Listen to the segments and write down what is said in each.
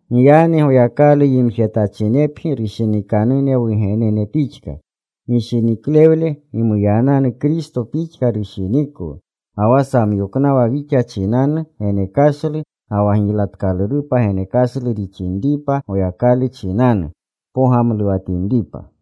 Giyagni Goyakalu yimjetachinepgi rushinikanune wugenene pixka. Gishiniklewle gimuyananu Kristo pixka rushinikwu, ga wa samyoknawa wixa chinanu genekashlu ga wa giylatkalurupa genekashlu rixinripa Goyakalu chinanu, pogamluwatinripa.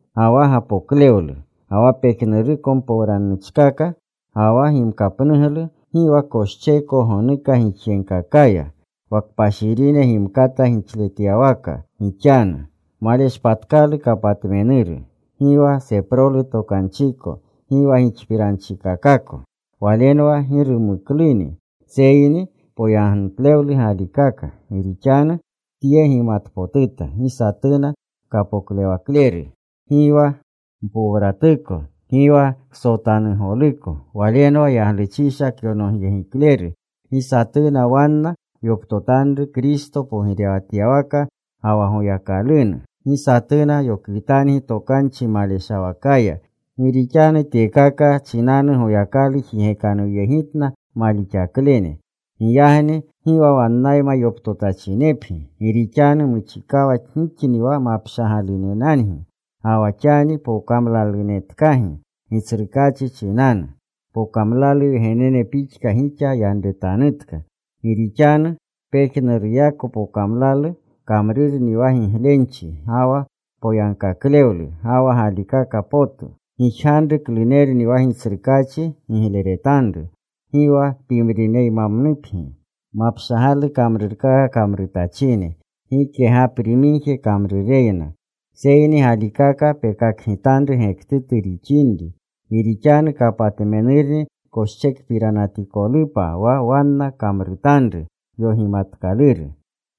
Ga wa gapoklewlu, ga wa pejnuruko mpowragnuchkaka, ga wa gimkapnuglu, gi wa koscheeko gonuka gixyegkakaya. Wa kpashirine gimkata gixletyawaka gixanu. Maleshpatkalu kapatmenuru, gi wa seprolu tokanchiko, gi wa gixpiranchikakako. Walenwa gi rumuknuni. Seyni poyagnutlewlu galikaka. Gi rixanu tye gimatpotuta: Gi satuna kapoklewakleru, gi wa mpowratuko, gi wa ksotanugoluko, walenwa yaglusha kyonogyegikleru, gi satuna wanna yoptotanru Kristo pogirewatyawaka ga wa Goyakalunu. Gi satuna yokwitangi tokanchi maleshawakaya. Gi rixanu tyekaka chinanu Goyakalu jigekanuwyegitna malixaklene. Giyagni gi wa wannayma yoptotachinepgi. Gi rixanu muchikawa gixni wa mapshagalunenangi. Ga wa xani pokamlalunetkagi Gitsrukaachi chinanu. Pokamlalu wgenene pixka gixa yanretanutka. Gi rixanu pejnuruyako pokamlalu kamrurni wa giglenchi ga wa poyagkaklewlu ga wa galikaka potu. Gijganru klunerni wa Gitsrukaachi gigleretanru. Gi wa pimrineymamnupgi mapshagalu kamrurkaka kamrutachine, gike gapri migje kamrureyna. Seyni galikaka pekakgitanru gektutu rixinri. Gi rixanu kapatmenurni koschekpiranatikolupa wa wanna kamrutanru yogimatkaluru.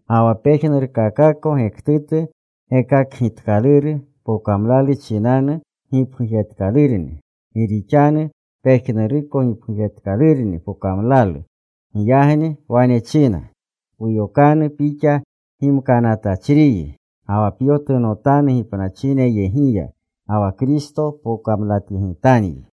Ga wa pejnurkakako gektutu gekakgitkaluru pokamlalu chinanu gipgujetkalurni. Gi rixanu pejnuruko gipgujetkalurni pokamlalu. Giyagni wane china: Puyokanu pixa gimkanatachriyi. Ga wa pyotunotanu gipnachineyegiya. Ga wa Kristo pokamlatyegitanyi.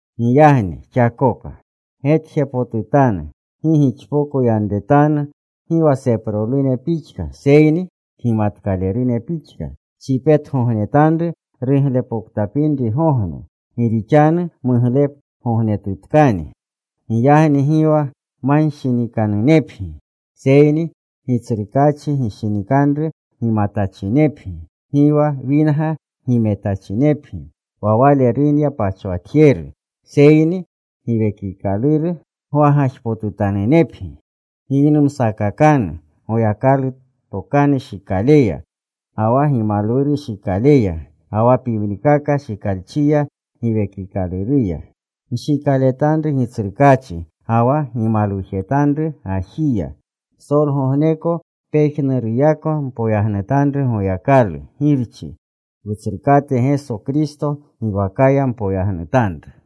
Giyagni xakoka. Getjepotutanu gi gixpoko yanretanu gi wa seprolune pixka, seyni kgimatkalerune pixka. Pchipetgognetanru ruglepoktapinrigogne, gi rixanu muglegognetkakni. Giyagni gi wa manshinikanunepgi, seyni Gitsrukaachi gishinikanru gimatachinepgi. Gi wa winga gimetachinepgi. Wa wale runya pachwatjeru. Seyni Giwekikaluru gwagajpotutanunepgi. Giynumsakakanu Goyakalu tokanu shikaleya, ga wa gimalwuru shikaleya, ga wa pimrikaka shikalchiya Giwekikaluruya. Nshikaletanru Gitsrukaachi ga wa gimalwujetanru gajiya. Psolgogneko pejnuruyako mpoyagnutanru Goyakalu Girchi. Wutsrukate Geso Kristo giwakaya mpoyagnutanru.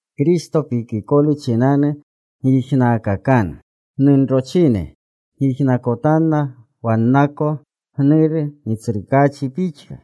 Kristo pikikolu chinanu gyijnaakakanu. Gnunrochine yijnakotanna wannako gnuru Gitsrukaachi pixka.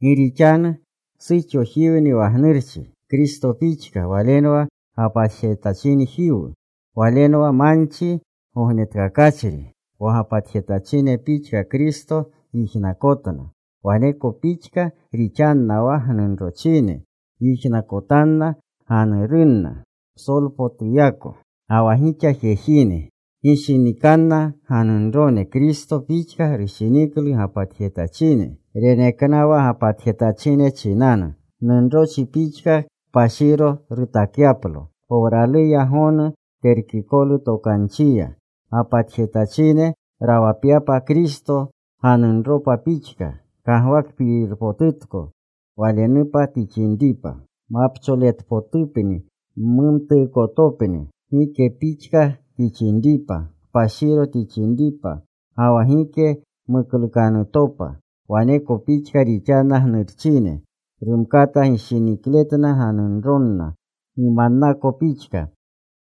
Gi rixanu suxojiwni wa gnurchi, Kristo pixka Walenwa gapatjetachinmanjiwu. Walenwa manchi gognetkakachri. Wa gapatjetachine pixka Kristo yijnakotna, waneko pixka rixanna wa gnunrochine yijnakotanna ganurunna psolpotuyako. Ga wa gixa jejine, gishinikanna ganunrone Kristo pixka rushiniklu gapatjetachine. Reneknawa gapatjetachine chinanu. Gnunrochi pixka kpashiro rutakyaplo, powraluya gonu terkikolu tokanchiya. Gapatjetachine rawapyapa Kristo ganunropa pixka. Kagwakpirpotutko. Walenupa tixinripa, mapcholetpotupni, mumtuukotopni, gike pixka tixinripa, kpashiro tixinripa, ga wa gike muklukanutopa. Waneko pixka rixanna gnurchine. Rumkata gishinikletna ganunronna gimannako pixka.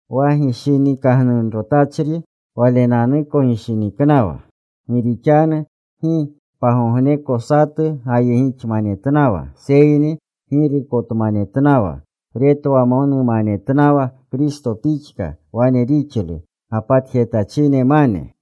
Wa gishinikagnunrotachri walenanuko gishiniknawa. Gi rixanu gi pagogneko satu gayegixmanetnawa, seyni girukotmanetnawa. Retwamonmanetnawa Kristo pixka wane rixlu gapatjetachinemane.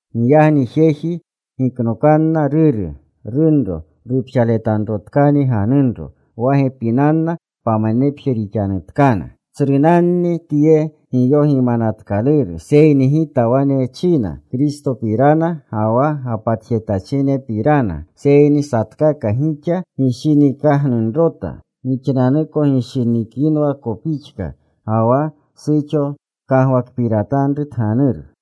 Giyagni jeji giknokanna ruru, runro. Rupxaletanrotkani ganunro. Wa gepinanna pamanepje rixanutkana. Tsrunanni tye giyogimanatkaluru, seyni gita wane china Kristopirana ga wa gapatjetachinepirana. Seyni satkaka gixa gishinikagnunrota, gixnanuko gishinikinwako pixka. Ga wa suxo kagwakpiratanru tganuru.